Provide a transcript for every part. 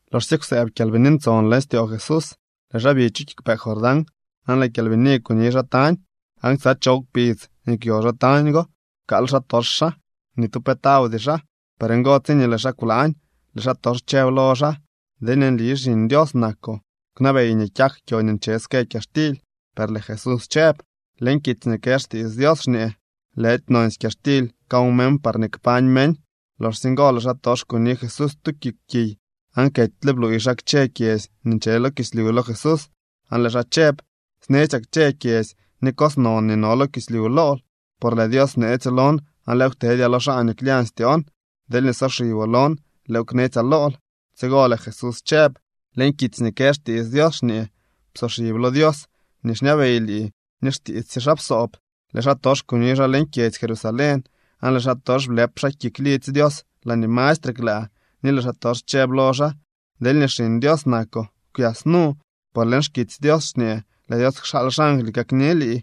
Loxsye kwsëëb Kyalbini Ntson leñ styoo Jesús, lëë xaa bi chu kiigwpee Jordán, aan lëë Kyalbini kuni xaa tañ. Aan ksa choow kpidz nii kwyo xaa tañ go pkaal xaatox xaa. Ni tu pe tawdy xaa. Por ngo, tsiñee lëë xaa kwlaañ, lëë xaatox chëb lo xaa: —Deelñee nli Xiñ Dios nakoo, kwnabey nii kyak kyo nii nche ske kyaxtily. Per lëë Jesús chëb: —Leñ kitsy nii kë xtiits Dios xñee: “Lëdy nonsy kyaxtily kaw meñ parñee kpañ meñ.” Loxsye ngo lëë xaatox kuni Jesús tu kik kiy aan ketyle bluuy xaa kchë kyedzy nii nche lo kislyu lo Jesús, aan lëë xaa chëb: —Snetsyaa kchë kyedzy ni cos non nii no lo kislyu lool, por lëë Dios bneetsyo lon aan lëëw ktedyaa lo xaa nii klyañ styoon. Deelñee soxiboo lon, lëëw knetsyaa lool. Tsigo lëë Jesús chëb: —Leñ kitsy nii kë xtiits Dios xñee: “Psoxib lo Dios nii xñabey lii ni xtiits sye xaa psoob.” Lëë xaatox kuni xaa leñ kyedzy Jerusalén, aan lëë xaatox blëp xaa kik lidzy Dios laañee mastre klaa, ni lëë xaatox chëb lo xaa: —Deelñee Xiñ Dios nakoo, kwyas nu, por leñ xkitsy Dios xñee: “Lëë Dios kxaal xangly kakni lii.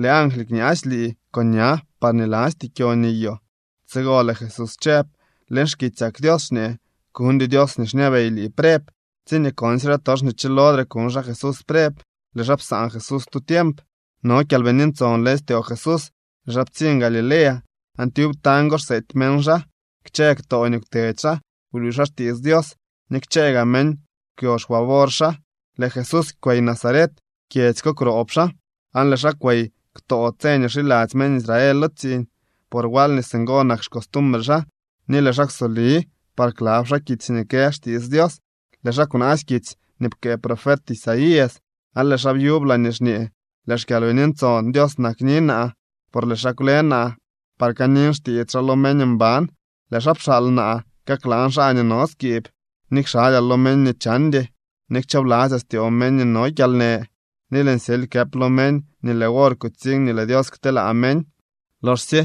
Lëë angly kñaasy lii con ña, parñee lasty kyo niyoo.” Tsigo lëë Jesús chëb: —Leñ xkitsyak Dios xñee: “Kuñdyoo Dios nii xñabey lii preb.” Tsiñee konsye xaatox nii chilodre kuñ xaa Jesús preb, lëë xaa psaan Jesús tu tiemp. No Kyalbini Ntson leñ styoo Jesús, lëë xaa ptsiñ Galilea, aan tyub tañ go xseety meñ xaa. Kchë ktoo nii kwtedy xaa bluuy xaa xtiits Dios, ni kchë gaa meñ kwyo xfavor xaa. Lëë Jesús kwey Nazaret. Kyedzy ko kwroob xaa. Aan lëë xaa kwey ktoo tse nii xiladzy meñ Israel, por wal nii singo nak xcostumbre xaa, ni lëë xaa kwsoli par klab xaa kitsy nii kë xtiits Dios. Lëë xaa kwnaasy kitsy nii pkëë profet Isaías aan lëë xaa byub laañee xñee: Lëë xKyalbini Ntson Dios nakni naa, por lëë xaa kwle naa par kanin xtiits xaa lo meñ mban. Lëë xaa pxaal naa kaklaan xaa nii no skiib, ni kxalyaa lo meñ nii chandy, ni kchoobladzyaa styoo meñ nii no kyalnë. Ni lëën syely këp lo meñ nii lëë wor kutsiñ nii lëë Dios kteelaa meñ. Loxsye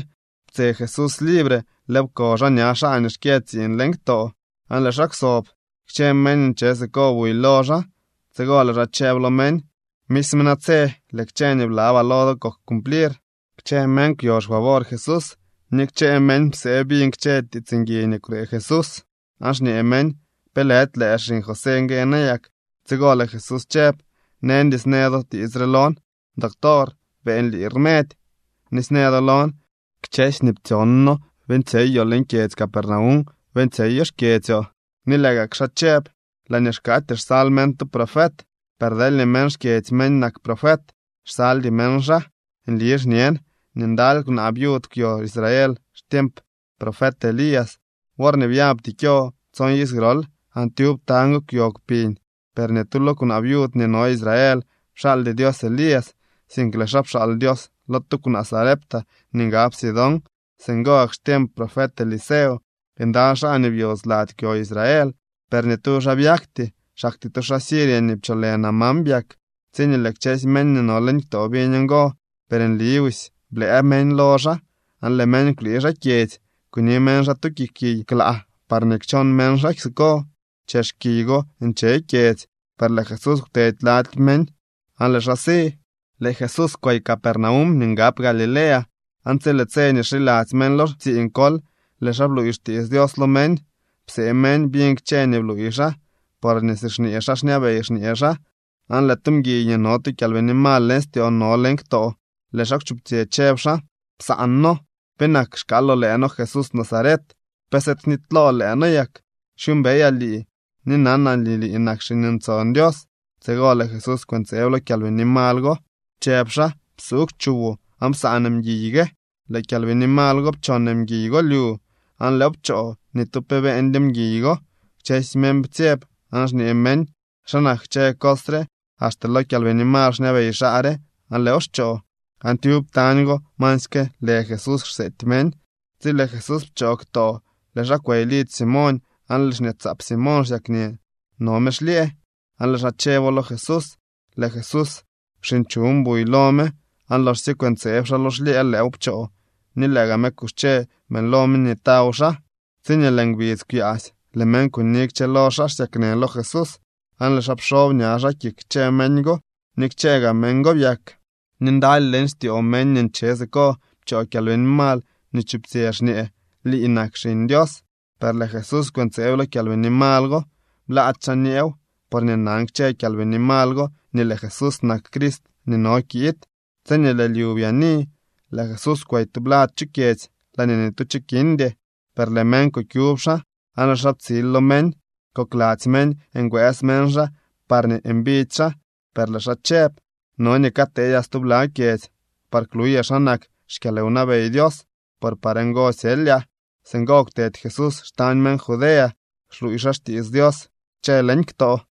ptse Jesús libre, lëëw pko xaa ña xaa nii xkyë tsiiñ leñ ktoo aan lëë xaa kwsob. Kchë meñ nii nche siko buy lo xaa. Tsigo lëë xaa chëb lo meñ: —Misme natse lëë kchë nii blabaa lo do kok cumplir. Kchë meñ kwyo xfavor Jesús ni kchë meñ psee biñ kchë tiits ngui nii kwnee Jesús. Aan xñee meñ: —¿Pe lëdy lëë xiñ José ngue nayak? Tsigo lëë Jesús chëb: —Neñdy snë do tiits re lon: “Doctor, beeñ lii rmedy.” Ni snë do lon: “Kchësy nii ptsyon noo beeñtsyeyoo leñ kyedzy Capernaum, beeñtsyeyo xkyedzyoo.” Ni lëë gak xaa chëb: —Laañee xkaatyee xsal meñ tu profet, per deelñee meñ xkyedzy meñ nak profet, xsaldy meñ xaa. Nli xñen nii ndaly kwnaa viud kwyo Israel xtiemp profet Elías worñee byabty kyo tson iz grol, aan tyub tañ go kwyo kpiñ. Per ni tu lo kwnaa viud nii no Israel pxaaldy Dios Elías, sink lëë xaa pxaal Dios lo tu kwnaa Sarepta nii ngab Sidón. Singo gak xtiemp profet Eliseo ndaly xaa nii byodz lady kwyo Israel, per ni tu xaa byakty. Xaktyee tu xaa Siria nii pcholë Naamán byak. Tsiñee lëë kchësy meñ nii no leñ ktoo biñ ngo, per nli busy blëë meñ lo xaa. Aan lëë meñ kwlii xaa kyedzy. Kuni meñ xaa tu kik kiy klaa parñee kchon meñ xaa siko. Chex kiy go nche kyedzy. Per lëë Jesús kwtedy lady meñ aan lëë xaa si. Lëë Jesús kwey Capernaum nii ngab Galilea, aan tsi lëë tse nii xiladzy meñ lo tsiiñ kol, lëë xaa bluuy xtiits Dios lo meñ. Psee meñ biñ kchë nii bluuy xaa, porñee si xñee xaa xñabey xñee xaa. Aan lëë tu mguiy nii no tu kyalbini mal leñ styoo no leñ ktoo. Lëë xaa kwchuptsyë chëb xaa: —Psaan noo. ¿Penak xkaaloo lëë noo, Jesús Nazaret? ¿Pe sëëd knitylool lëë noo yak? Xyuumbeyaa lii ni nanaa nii lii nak Xiñ Ntson Dios. Tsigo lëë Jesús kwëntseeb lo kyalbini mal go, chëb xaa: —¡Psuugw chuwoo aan psaan mguiy gue! Lëë kyalbini mal go pchon mguiy go lyu, aan lëëw pchoo. Ni tu pe beeñdyo mguiy go. Kchësy meñ ptsyeb aan xñee meñ: —¿Xa nak kchë cos re? ¡Axte lo kyalbini mal xñabey xaa re aan lëëw xchoo! Aan tyub tañ go masyke lë Jesús xseety meñ. Tsi lëë Jesús pchoo ktoo, lëë xaa kwey lidzy Simoñ, aan lëë xñaatsaap Simoñ xsyaknë, no me xlyëë. Aan lëë xaa chëbo lo Jesús. Lëë Jesús kwxinchuñ buy lo me aan loxsye kwëntseeb xaa lo xlyëë, lëëw pchoo ni lëë gaa me kuxche beeñlo me nii taw xaa. Tsiñee lëë ngbidz kwyaasy, lëë meñ kuni kchëlo xaa xsyaknë lo Jesús, aan lëë xaa pxob ña xaa kik kchë meñ go, ni kchë gaa meñ go byak. Ni ndaly leñ styoo meñ nii nche siko pchoo kyalbini mal nii chuptsyë, xñee: —Lii nak Xiñ Dios. Per lëë Jesús kwëntseeb lo kyalbini mal go. Blaady xaa nyeew, porñee nan kchë kyalbini mal go nii lëë Jesús nak Crist nii no kiid. Tsiñee lëë lyu byaani, lëë Jesús kwey tublad chu kyedzy laañee ni tu cho kindy. Per lëë meñ kukyub xaa, aan lëë xaa ptsil lo meñ. Kokladzy meñ ngwëës meñ xaa parñee mbidy xaa, per lëë xaa chëb: —No nii kateedyaa stubla kyedzy par kluyaa xa nak xkyalwnabey Dios, por par ngo syelyaa. Singo kwtedy Jesús xtañ meñ Judea xluuy xaa xtiits Dios kchë leñ ktoo.